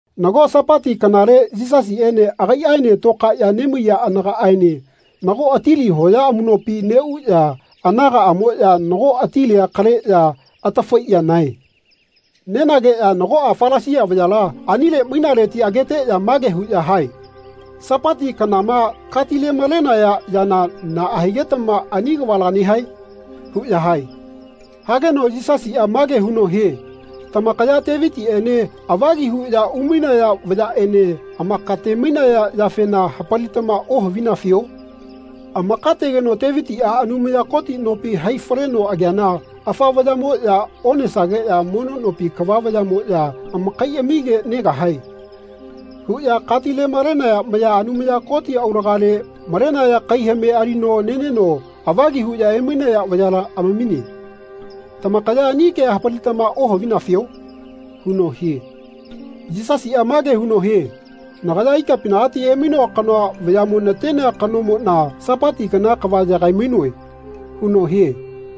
Nago Sapati kanale Yisasiꞌene agaiꞌaene tokaeꞌya nemaiya anagaꞌaene nago atili hoya amuꞌnopi neꞌuꞌya anagaꞌamoꞌya nago atilia kaleꞌya atafaiꞌya nae. Nenageꞌya nagoꞌa Falasia vayala anile mainaleti ageteꞌya mage huꞌya hae “Sapati kanama katilemalenaya yana naꞌa higetama ani kavala nehae?” huꞌya hae. Hageno Yisasiꞌa mage huno hie “Tamakaya Tevitiꞌene avagi huꞌya umainaya vayaꞌene amakatemainaya yafena hapalitama ohavinafio? Amakategeno Tevitiꞌa Anumaya Koti nopi hai faleno ageana ‘Afa vayamoꞌya onesageꞌya mono nopi kava vayaꞌmoꞌya amakaiꞌamige negahae.’ huꞌya katilemalenaya maya Anumaya Koti aulagale malenaya kaihame alino neneno avagi huꞌya emainaya vayala amamine. Tamakaya ani kea hapalitama ohavinafio?” huno hie. Yisasiꞌa mage huno hie “Nagaya ikapinagati emainoa kanoa vayaꞌmo natenea kanomoꞌna Sapati kana kava yagaimainoe.” huno hie.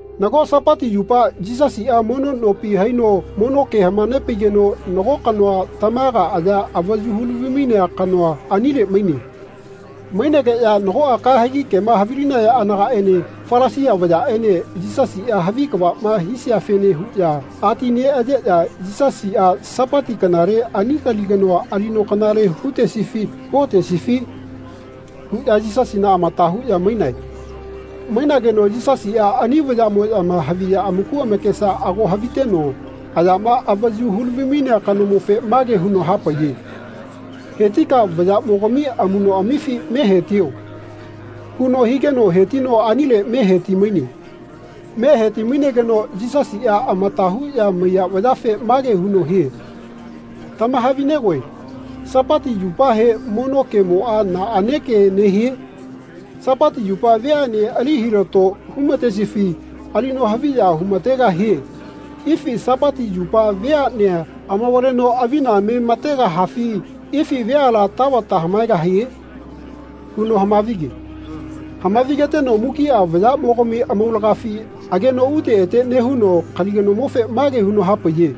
Nago Sapati yupa Yisasiꞌa mono nopi haino mono ke hamanepaigeno nago kanoa tamaga aya avayu hulavimainea kanoa anile maine. Mainegeꞌya nagoꞌa kahegi kema havilinaya anagaꞌene Falasia vayaꞌene Yisasiꞌa havi kavaꞌma hisiafene huꞌya ati neꞌayeꞌya “Yisasiꞌa Sapati kanale ani kali kanoa alino kanale hutesifi huotesifi?” huꞌya Yisasina amata huꞌya mainae. Mainageno Yisasiꞌa ani vayaꞌmoꞌyama haviya amaku amakesa ago haviteno ayama avayu hulavimainea kanomofe mage huno hapaiye “Hetika vayaꞌmogami amuꞌnoꞌamifi me hetio.” huno higeno hetino anile me hetimaine. Me hetimainegeno Yisasiꞌa amata huꞌya maiya vayafe mage huno hie “Tamahavinegoe Sapati yupahe mono kemoꞌa naꞌane ke nehie? Sapati yupa veaꞌne ali hilato humatesifi alino haviya humategahie ifi Sapati yupa veaꞌnea amavaleno avina me mategahafi ifi veala tavata hamaegahie?” huno hamavige. Hamavigeteno mukiꞌa vayaꞌmogami amaulagafi ageno ute ete nehuno kali kanomofe mage huno hapaiye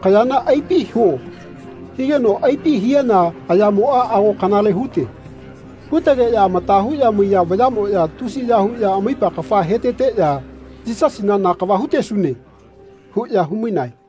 “Kayana aipi huo.” higeno aipi hiana ayamoꞌa ago kanale hute. Hutegeꞌya amata huꞌya maiya vayaꞌmoꞌya tusiya huꞌya amaipa kafa heteteꞌya “Yisasina na kava hutesune.” huꞌya humainae.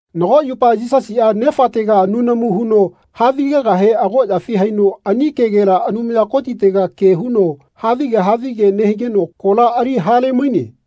Nago yupa Yisasiꞌa Nefatega nunamu huno havigegahe agoꞌyafi haino ani kegela Anumaya Kotitega ke huno havige havige nehigeno kola ali halemaine.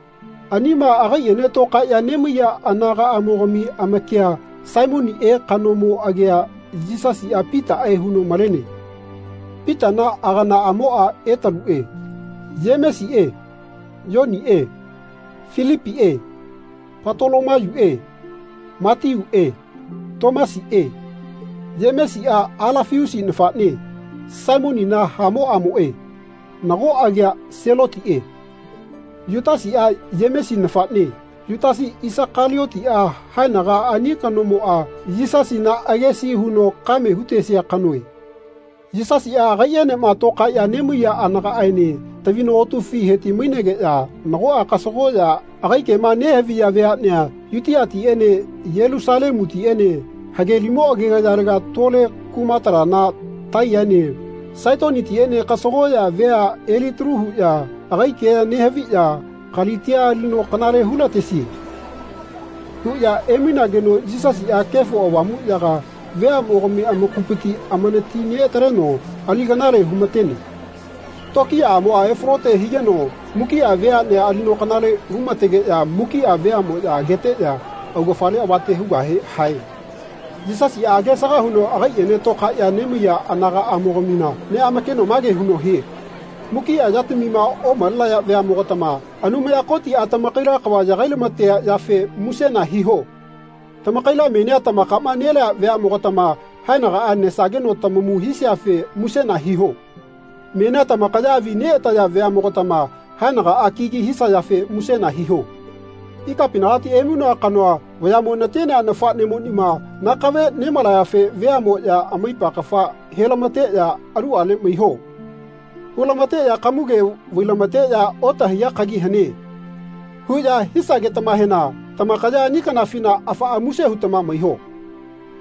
Anima agaiꞌene tokaeꞌya nemaiya anagaꞌamogami amakia Saimoniꞌe kanomo agia Yisasiꞌa Pitaꞌe huno malene. Pitana aganaꞌamoꞌa Etaluꞌe, Yemesiꞌe Yoniꞌe Filipiꞌe Patolomayuꞌe Matiuꞌe, Tomasiꞌe, Yemesiꞌa Alafiusi nafaꞌne Saimonina hamoꞌamoꞌe nago agia Selotiꞌe. Yutasiꞌa Yemesi nafaꞌne, Yutasi Isakaliotiꞌa haenaga ani kanomoꞌa Yisasina agesi huno kame hutesia kanoe. Yisasiꞌa agaiꞌenema tokaeꞌya nemaiya anagaꞌaene tavino otufi hetimainegeꞌya nagoꞌa kasagoꞌya agai kema nehaviya veaꞌnea Yutiatiꞌene Yelusalemutiꞌene hage limo agegayalega tole kumatalana Taiyaene Saitonitiꞌene kasagoꞌya vea elitalu huꞌya agai kea nehaviꞌya “Kalitia alino kanale hulatesie.” huꞌya emainageno Yisasiꞌa Kefo Avamuꞌyaga veaꞌmogami amakupiti amanati neꞌataleno alino kanale humatene. Tokiyaꞌamoꞌa efalote higeno mukiꞌa veaꞌnea alino kanale humategeꞌya mukiꞌa veaꞌmoꞌya ageteꞌya augafale avate hugahe hae. Yisasiꞌa agesaga huno agaiꞌene toꞌkaeꞌya nemaiya anagaꞌamogamina neꞌamakeno mage huno hie “Mukiꞌa yatamima omalenaya veaꞌnemogatama Anumaya Kotiꞌa tamakaila kava yagai nelamatea yafe musena hiho. Tamakaila menia tamakaꞌma nelea veaꞌmogatama haenagaꞌa nesageno tamamu hisiafe musena hiho. Menia tamakaya avi neꞌataya veaꞌnemogatama haenagaꞌa kigi hisayafe musena hiho. Ikapinagati emainoa kanoa vayaꞌmo natenea nafaꞌnemonima nakave nemalayafe veaꞌnemoꞌya amaipa kafa helamateꞌya ‘Aluꞌale maiho.’ hulamateꞌya kamuge vailamateꞌya ‘Otahaiya kagi hane.’ huꞌya hisagetamahena tamakaya ani kanafina afaꞌa muse hutama maiho.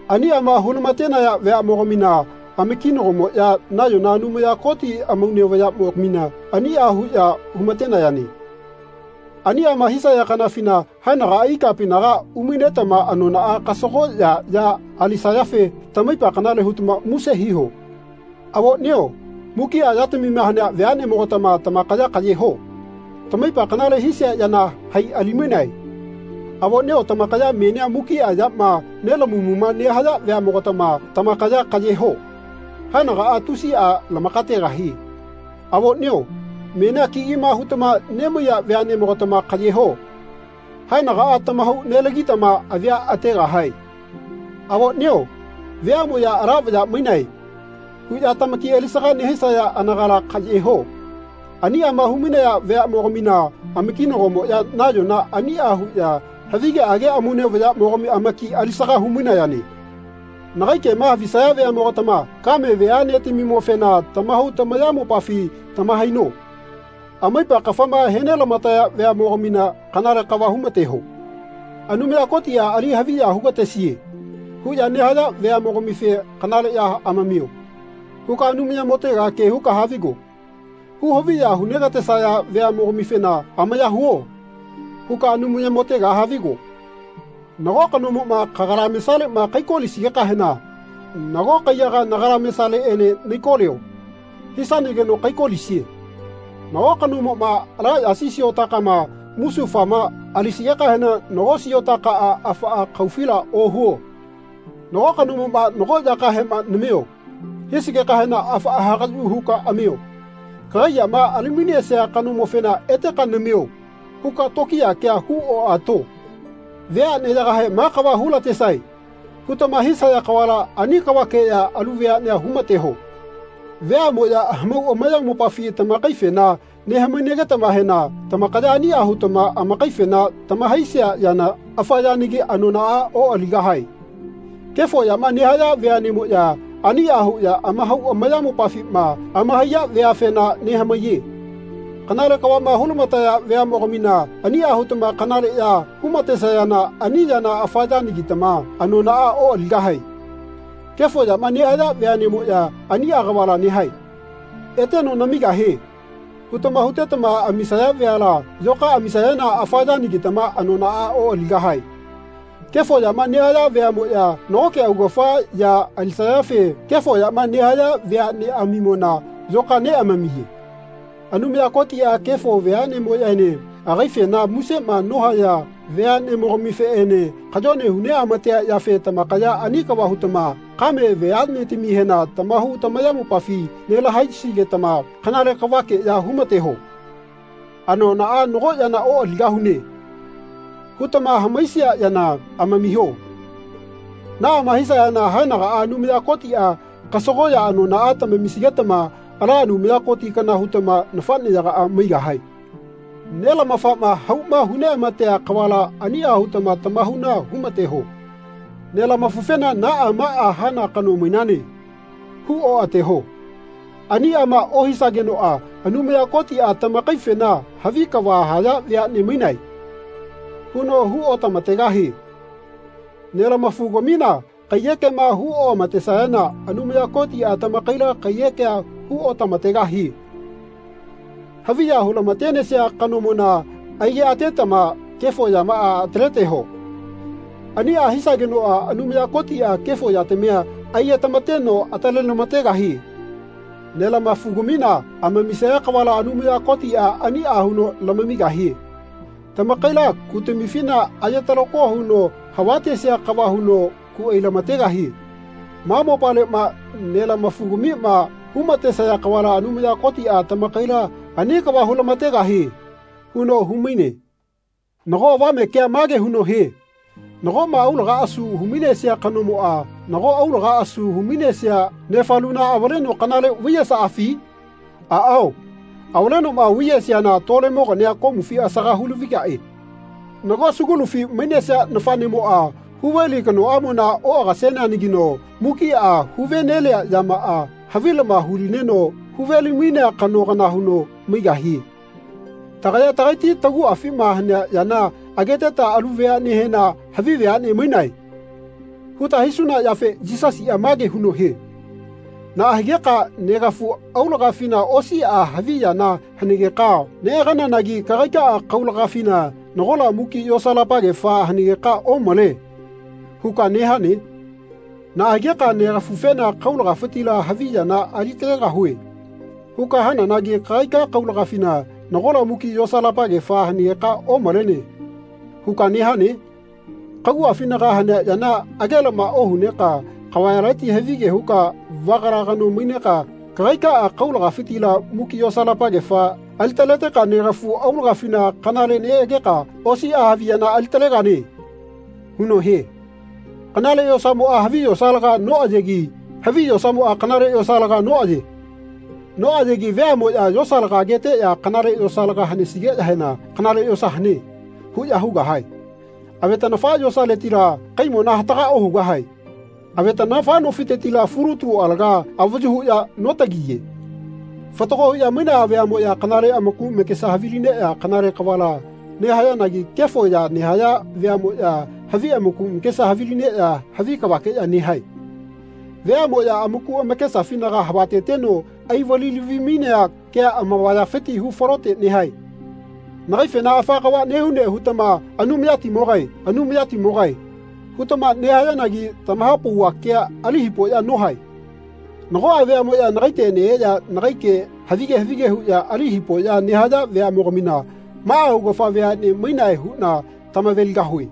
Aniꞌama hulamatenaya veaꞌneꞌmogamina amakinagomoꞌya nayona Anumaya Koti amaune vayaꞌmogamina aniꞌa huꞌya humatenayane. Aniꞌama hisaya kanafina haenagaꞌa ikapinaga umainetama anonaꞌa kasagoꞌya ya alisayafe tamaipa kanale hutama muse hiho. Avoꞌnio mukiꞌa yatamima hanea veaꞌneꞌmogatama tamakaya kaꞌye ho. Tamaipa kanale hisia yana hai ali mainae. Avoꞌnio tamakaya menia mukiꞌa yama nelamamuꞌma nehaya veaꞌmogatama tamakaya kaꞌye ho. Haenagaꞌa tusiꞌa lamakategahie. Avoꞌnio menia kigima hutama nemaiya veaꞌnemogatama kaꞌye ho. Haenagaꞌa tamahau nelagitama avia ategahae. Avoꞌnio veaꞌmoꞌya ‘Ala vaya mainae.’ huꞌya tamaki alisaga nehisaya anagala kaꞌye ho. Aniꞌama humainaya veaꞌnemogamina amakinagomoꞌya nayona aniꞌa huꞌya havigeꞌage amaune vayamogami amaki alisaga humainayane.” “Nagai kema havisaya veaꞌmogatama ‘Kame veaꞌnetamimofena tamahau tamayamopafi tamahaino. Amaipa kafama henelamataya veaꞌnemogamina kanale kava humateho.’ ‘Anumaya Kotiꞌa ali haviya hugatesie.’ huꞌya nehaya veaꞌmogamife ‘Kanale ya amamio.’ huka Anumayamotega ke huka havigo. Hu haviya hunegatesaya veaꞌnemogamifena ‘Amaya huo.’ huka Anumayamotega havigo. Nago kanomoꞌma kagalamesaleꞌma kaikolisigekahena ‘Nago kaiyaga nagalamesaleꞌene naikolio.’ hisanageno kaikolisie. Nago kanomoꞌma ala yasi siotakama musufama alisigekahena nago siotakaꞌa afaꞌa kaufila ohuo. Nago kanomoꞌma ‘Nago yakahema namio.’ hisigekahena afaꞌa hagaꞌyu huka amio. Kagai yama alimainesia kanomofena ‘Eteka namio.’ huka tokiya kea hu oꞌato. Veaꞌneyagahe ‘Ma kava hulatesae.’ hutama hisaya kavala ani kavakeꞌya alu veaꞌnea humateho. Veaꞌmoꞌya hamau amayamopafi tamakaifena nehamainagetamahena tamakaya aniꞌa hutama amakaifena tamahaisia yana afa yanagi anonaꞌa oꞌaligahae. Kefo yama nehaya veaꞌnemoꞌya aniꞌa huꞌya amahau amayamopafima amahaiya veafena nehamaiye. Kanale kavaꞌma hulamataya veaꞌnemogamina aniꞌa hutama kanale ya humatesayana ani yana afa yanagitama anonaꞌa oꞌaligahae. Kefo yama nehaya veaꞌnemoꞌya aniꞌa kavala nehae. ‘Eteno namigahie.’ hutama hutetama amisaya veala yoka amisayana afa yanagitama anonaꞌa oꞌaligahae. Kefo yama nehaya veaꞌmoꞌya nagoke augafa ya alisayafe kefo yama nehaya veaꞌneꞌamimona yoka neꞌamamiye. Anumaya Kotiꞌa kefo veaꞌnemoꞌyaene agaifena musema nohaya veaꞌnemogamifeꞌene kayone huneꞌamatea yafe tamakaya ani kava hutama kame veaꞌnetamihena tamahau tamayamopafi nelamahaisigetama kanale kavakeꞌya humateho. ‘Anonaꞌa nago yana oꞌaligahune.’ hutama hamaisia yana amamiho. Naꞌama hisayana haenagaꞌa Anumaya Kotiꞌa kasagoꞌya anonaꞌa tamamisigetama ala Anumaya Koti kana hutama nafaꞌneyagaꞌa maigahae. Nelamafaꞌma hauma huneꞌamatea kavala aniꞌa hutama tamahauna humateho.” “Nelamafufena ‘Naꞌa maꞌa hana kano mainane.’ hu oꞌateho. Aniꞌama ohisagenoꞌa Anumaya Kotiꞌa tamakaifena ‘Havi kava haya veaꞌne mainae.’ huno hu otamategahie. Nelamafugamina kaiyekema hu oꞌamatesayana Anumaya Kotiꞌa tamakaila kaiyekea hu otamategahie. Haviya hulamatenesia kanomona aigeꞌatetama kefo yamaꞌa ataleteho. Aniꞌa hisagenoꞌa Anumaya Kotiꞌa kefo yatamia aigetamateno atalelamategahie. Nelamafugamima amamisaya kavala Anumaya Kotiꞌa aniꞌa huno lamamigahie. Tamakaila kutamifina aye talako huno havatesia kava huno ku ailamategahie. Ma mopaleꞌma nelamafugamima humatesaya kavala Anumaya Kotiꞌa tamakaila ani kava hulamategahie.” huno humaine. Nago avame kea mage huno hie “Nagoꞌma aulaga asu humainesia kanomoꞌa nago aulaga asu humainesia nefaluna avaleno kanale vaiyesaꞌafi? Aꞌao avalenoꞌma vaiyesiana tolemogania komufi asaga hulavigaꞌe. Nago sugulufi mainesia nafaꞌnemoꞌa huveli kanoꞌamona oꞌagaseneanagino mukiꞌa huvenelia yamaꞌa havilama hulineno huvelimainea kano kana huno maigahie.” Tagaya tagaiti taguꞌafima hanea yana ageteta alu veaꞌnehena “Havi veaꞌne mainae.” huta hisuna yafe Yisasiꞌa mage huno hie “Naꞌa higeka negafu aulagafina osiꞌa havi yana hanegeka neꞌagananagi kagaikaꞌa kaulagafina nagola muki yosalapagefa hanegeka ‘Omale.’ huka nehane? Naꞌa higeka negafufena ‘Kaulagafitila havi yana alitalegahue.’ huka hananagi kagaika kaulagafina nagola muki yosalapagefa hanegeka ‘Omalene.’ huka nehane? Kaguꞌafinaga hanea yana agelama ohuneka kavayaleti havige huka vagala kano maineka kagaikaꞌa kaulagafitila muki yosalapagefa alitaleteka negafu aulagafina kanale neꞌageka osiꞌa havi yana alitalegane.” huno hie. “Kanale yosamoꞌa havi yosalaga noꞌayegi havi yosamoꞌa kanale yosalaga noꞌaye. Noꞌayegi veaꞌmoꞌya yosalaga ageteꞌya kanale yosalaga hanesigeꞌyahena ‘Kanale yosa hane.’ huꞌya hugahae. Avetaꞌnafa yosaletila kaimona hataga ohugahae. Avetaꞌnafa nofitetila fulutu alaga avayu huꞌya notagiye. Fatago huꞌya mainaya veaꞌmoꞌya kanale amaku amakesa havilineꞌya kanale kavala nehayanagi kefo ya nehaya veaꞌmoꞌya havi amaku amakesa havilineꞌya havi kavakeꞌya nehae. Veaꞌmoꞌya amaku amakesafinaga havateteno aivalilavimainea kea amavayafiti hu falote nehae.” “Nagaifena afa kava nehune hutama ‘Anumayatimogae, Anumayatimogae.’ hutama nehayanagi tamahapauva kea ali hipoꞌya nohae. Nagoꞌa veaꞌmoꞌya nagaite neꞌeꞌya nagai ke havige havige huꞌya ali hipoꞌya nehaya veaꞌmogamina maꞌa augafa veaꞌne mainae huꞌna tamaveligahue.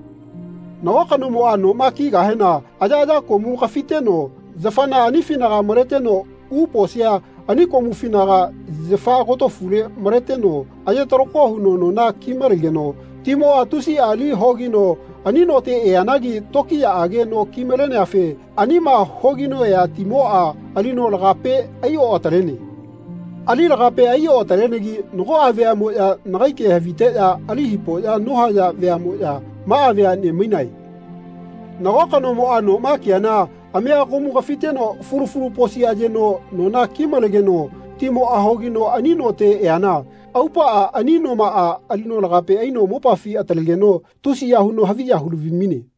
Nago kanomoꞌa noma kigahena ayaꞌaya komu kafiteno yafana anifinaga maleteno u posia ani komufinaga yafa agotofule maleteno aye talako huno nona kimalegeno timoꞌa tusiꞌa li hogino ani note eanagi tokiyaꞌage no kimaleneafe anima hogino ea timoꞌa alino lagape aioꞌatalene. Ali lagape aioꞌatalenegi nagoꞌa veaꞌmoꞌya nagai ke haviteꞌya ali hipoꞌya nohaya veaꞌmoꞌya maꞌa veaꞌne mainae. Nago kanomoꞌa noma kiana amega komu kafiteno fulu fulu posi ayeno nona kimalenegeno timoꞌa hogino ani note eana aupaꞌa ani nomaꞌa ali lagape aino mopafi atalegeno tusiya huno haviya hulavimaine.”